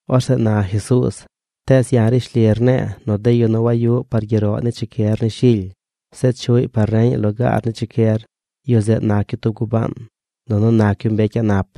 Orzeꞌ na Jesuuz: ―Tees ya̱ rishli rne̱e̱ nu de yu nu wayuꞌ par gyeroꞌ ni chicyer ni shily, zeꞌ chuꞌy par reñaꞌ lugaar ni chicyer, yu zeꞌ nac yu tub gubaan, nunu nac yu mbecy a̱ꞌ nap.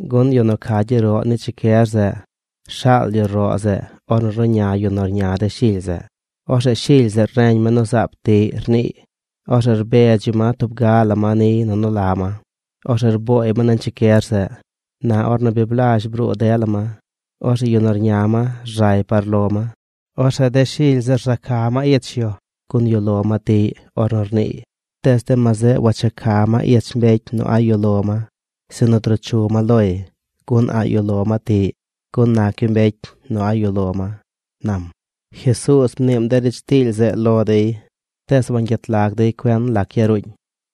Gun yu nu ca gyeroꞌ ni chicyer zeꞌ rshaal yu roꞌ zeꞌ ornu ruꞌña yu nu rña de shily zeꞌ. Orzeꞌ shily zeꞌ reñ ma nu zaab tiꞌy rniiy. Orzeꞌ rbedz yu ma tub ga la ma niy nu nu la ma. Orzeꞌ rbooy ma nañ chicyer zeꞌ. Na ornu bi blazh bruu dela ma, orzeꞌ yu nu rña ma rzay par lo ma. Orzeꞌ de shily zeꞌ za ca ma ich yu gun yuꞌ lo ma tiꞌy ornu rniiy. Tees de ma zeꞌ wacha ca ma ich mbecy nu a̱ꞌ yuꞌ lo ma, sinu druu chu ma loy, gun a̱ꞌ yuꞌ lo ma tiꞌy, gun nac yu mbecy a̱ꞌ yuꞌ lo ma ―nam. Jesuuz mniim de riidz tiily zeꞌ lo dey, tees wangyet lagy dey cuen lac yaruuñ.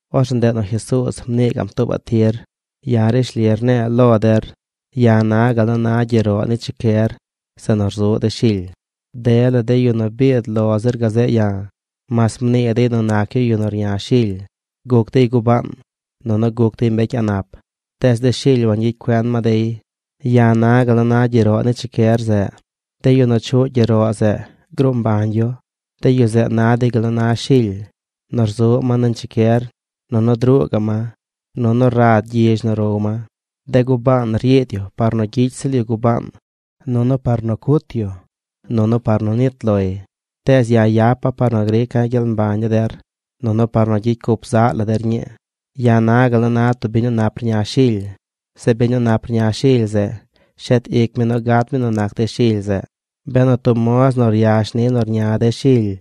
Orzeꞌ ndeꞌ nu Jesuuz mnii gaꞌm tuubaꞌ tir: ―Ya̱ rishli rne̱e̱ lo der: ya̱ na gal nu na gyeroꞌ ni chicyer zeꞌ nu rzuꞌ de shily. Dela de yu nu biid lo zir gazeꞌ ya̱, mas mnii dey nu nac yu yu nu rña shily, guc dey gubaan, nunu guc dey mbecy a̱ꞌ nap. Tees de shily wangyicy cuen ma dey. Ya̱ na gal na gyeroꞌ ni chicyer zeꞌ. De yu nu chuꞌ gyeroꞌ zeꞌ, gruu mbañ yu. De yu zeꞌ na dey gal nu na shily: nu rzuꞌ ma nañ chicyer, nunu druu gaꞌ ma, nunu rad gyizh nu row ma. ’De gubaan ryiid yu par nu gyicy ziꞌl yu gubaan, nunu par nu cut yu, nunu par nu nit loy; tees ya̱ yapa̱ par nu grica̱ gyel mbañ ni der, nunu par nu gyicy cup zaꞌ la der ñii. ’Ya̱ na gal nu na tub biñ nu nap rña shily. Zeꞌ biñ nu nap rña shily zeꞌ, shet ic mi nu gat mi nu nac de shily zeꞌ. Benu tub moz nu ryash ni nu rña de shily,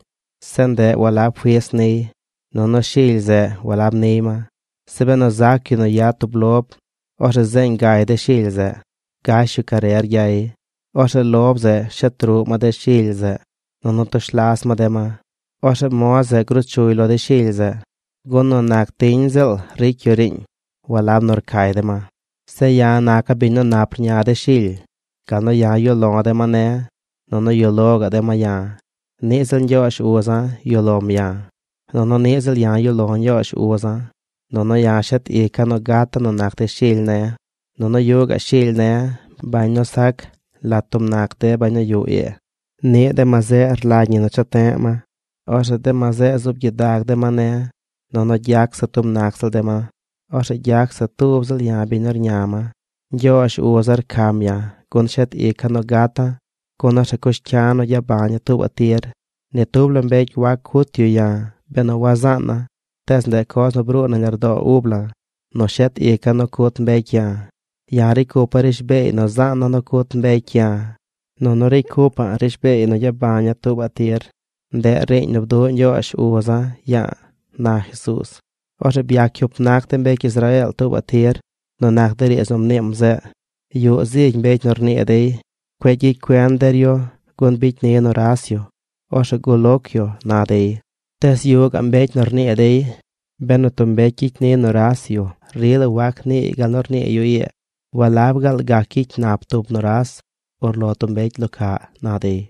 zeꞌ ndeꞌ walab fis niy, nunu shily zeꞌ walab niy ma, zeꞌ benu zac yu nu yad tub lob, orzeꞌ zeeñ gay de shily zeꞌ. Gash yu carer gyay. Orzeꞌ lob zeꞌ shet ruꞌ ma de shily zeꞌ, nunu tush las ma de ma. Orzeꞌ moz zeꞌ gruu chuy lo de shily zeꞌ, gun nu nac tiñ ziꞌl ricy yu riiñ, walab nu rcay de ma. ’Zeꞌ ya̱ naca̱ biñ nu nap rña de shily. Gal nu ya̱ yuꞌ lo̱ de ma ne̱, nunu yuꞌ lo gaꞌ de ma ya̱, niꞌ ziꞌl Ñgyoozh uza̱ yuꞌ lom ya̱, nunu niꞌ ziꞌl ya̱ yuꞌ lo̱ Ñgyoozh uza̱. Nunu ya̱ shet ica̱ nu gata̱ nu nac de shily ne̱. Nunu yuꞌ gaꞌ shily ne̱: bañ nu sac lat tub nac de bañ nu yuꞌ ii. Niꞌ de ma zeꞌ rlagy ñi nu cha te̱ꞌ ma. Orzeꞌ de ma zeꞌ zuub gyidag de ma ne̱ nunu gyac se tub nac ziꞌl de ma. Orzeꞌ gyac se tub ziꞌl ya̱ biñ nu rña ma. ’Ñgyoozh uza̱ rcam ya̱ gun shet ica̱ nu gata̱, gun orzeꞌ cush cya̱ nu gyabañaꞌ tuubaꞌ tir. Ni tub la mbecy wac cut yu ya̱, benu wazaana̱. Tees ndeꞌ coz nu bruu nañ lardo̱o̱ ub la̱ nu shet ica̱ nu cut mbecy ya̱. Ya̱ ricy cupa̱ rishbeey nu zaana̱ nu cut mbecy ya̱, nunu ricy cupa̱ꞌ rishbeey nu gyabaña̱ tuubaꞌ tir. Ndeꞌ riiñ nu bduꞌ Ñgyoozh uza̱ ya̱a̱ ―na Jesuuz. Orzeꞌ byac cyup nac de mbecy Israeel tuubaꞌ tir nu nac de riidz nu mniim zeꞌ. Yuꞌ zigy mbecy nu rnii dey: ―Cueꞌ gyicy cuen der yu, gun bicy ni nuras yu. Orzeꞌ guloc yu ―na dey. Tees yuꞌ gaꞌ mbecy nu rnii dey: ―Benu tub mbecy gyicy ni nuras yu, rila wac niiy gal nu rnii yu ii. ¿Walab gaal gac gyicy nap tub nuras urlo tub mbecy lo caꞌ? ―na dey.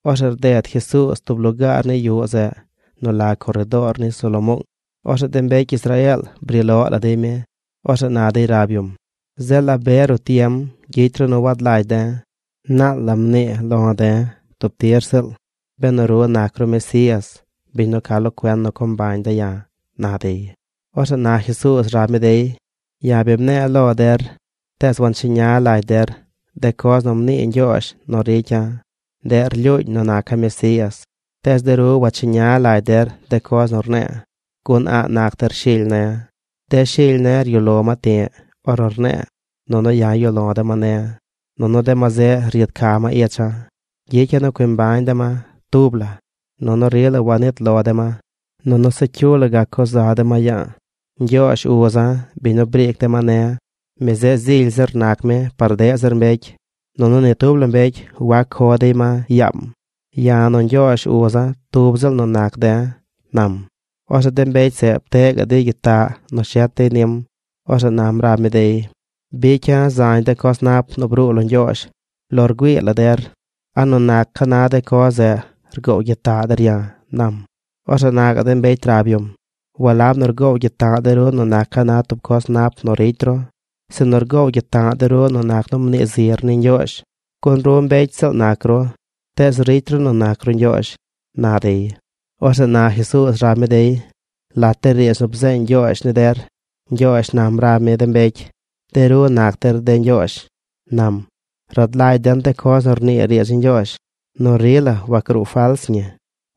Orzeꞌ rded Jesuuz tub lugaar ni yuꞌ zeꞌ nu la coredoor ni Salomoong. Orzeꞌ de mbecy Israeel bri loꞌ la dey mi. Orzeꞌ na dey rab yum: ―Zeꞌ ¿la be ruꞌ tiem gyicy ru nu wad lagy de̱? Naal la mnii lo̱ de̱ tub tir ziꞌl benu ru nac ru Mesías, biñ nu ca lo cuen nu co mbañ de̱ ya̱ ―na dey. Orzeꞌ na Jesuuz rab mi dey: ―Ya̱ bi mne̱e̱ lo der, tees wancheña lagy der. De coz nu mnii Ñgyoozh nu ricya̱, ndeꞌ rlyuuñ nu naca̱ Mesías. Tees de ru wacheña lagy der de coz nu rne̱e̱, gun a̱ꞌ nac der shily ne̱. De shily ne̱ ryuꞌ lo ma ti̱ꞌ ornu rne̱e̱. Nunu ya̱ yuꞌ lo̱ de ma ne̱. Nunu de ma zeꞌ ryiid ca ma icha̱. Gyicya̱ nu cui mbañ de ma tub la, nunu rila wanit lo de ma. Nunu se cyu la gac co za de ma ya̱a̱. Ñgyoozh uza̱, biñ nu briic de ma ne̱, mi zeꞌ zily zir nac mi par deꞌ zir mbecy. Nunu ni tub la mbecy wac co dey ma yaam. Ya̱ nu Ñgyoozh uza̱ tub ziꞌl nu nac de̱ ―nam. Orzeꞌ de mbecy zeꞌ pteꞌ gaꞌ dey gyitaꞌ nu shet dey nim. Orzeꞌ nam rab mi dey: ―Bicya̱ zañ de coz nap nu bruu lo Ñgyoozh lo rgüii la der. ¿A nu nac ca na de coz zeꞌ rgoow gyitaꞌ der ya̱? ―nam. Orzeꞌ na gaꞌ de mbecy rab yum: ―Walab nu rgoow gyitaꞌ de̱ ru nu nac ca na tub coz nap nu ricy ru, sinu rgoow gyitaꞌ de̱ ru nu nac nu mnii zir ni Ñgyoozh, gun ru mbecy ziꞌl nac ru, tees ricy ru nu nac ru Ñgyoozh ―na dey. Orzeꞌ na Jesuuz rab mi dey: ―Lat de riidz nu bzeeñ Ñgyoozh ni der, Ñgyoozh nam rab mi de mbecy: “De ru nac der de ñgyoozh”, nam. Rad lagy den de coz nu rnii riidz ni Ñgyoozh, nu rila wagruu fals ñi.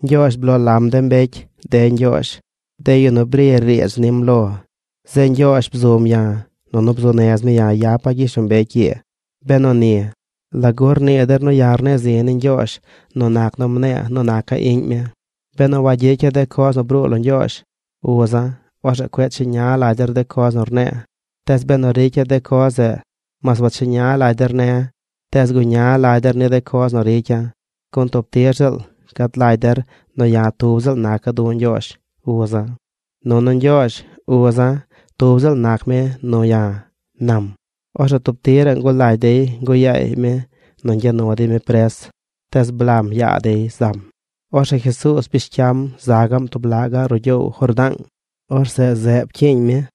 Ñgyoozh bloo lam de mbecy “De ñgyoozh”: de yu nu bri riidz nim lo. Zeꞌ Ñgyoozh bzum ya̱, nunu bzuu nez mi ya̱ yapa̱ gyishlombecy ii. Benu ni, ¿lagu rnii der nu ya̱ rne̱e̱ zi̱ ni Ñgyoozh nu nac nu mne̱e̱ nu naca̱ iꞌñ mi? Benu wagyicya̱ de coz nu bruu lo Ñgyoozh, uza̱, orzeꞌ cueꞌ cheña lagy der de coz nu rne̱e̱. Tees benu ricya̱ de coz zeꞌ, mas wacheña lagy der ne̱, tees guña lagy der ni de coz nu ricya̱, gun tub tir ziꞌl gad lagy der nu ya̱ tub ziꞌl naca̱ du̱ Ñgyoozh, uza̱, nunu Ñgyoozh, uza̱, tub ziꞌl nac mi nu ya̱ ―nam. Orzeꞌ tub tiraꞌ ngulagy dey nguꞌ yaay mi nu ñgya nu dey mi pres. Tees blam yaa dey zam. Orzeꞌ Jesuuz bish cyam za gaꞌm tub laꞌ gaꞌ ruꞌ gyoow Jordaang. Orzeꞌ pcyiiñ mi zeꞌ.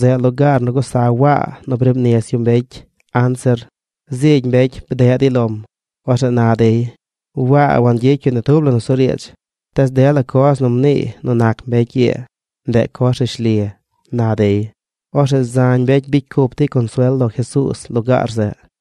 Zeꞌ lugaar nu gusa Waa briib nis yu mbecy anzir. Zigy mbecy bdeꞌ dey lom. Orzeꞌ na dey: ―Waa wangyicy yu ni tub la nusuriidz, tees dela coz nu mniiy nu nac mbecy ii, ndeꞌ coz rishli ―na dey. Orzeꞌ zañ mbecy bicy cup dey consuel lo Jesuuz lugaar zeꞌ.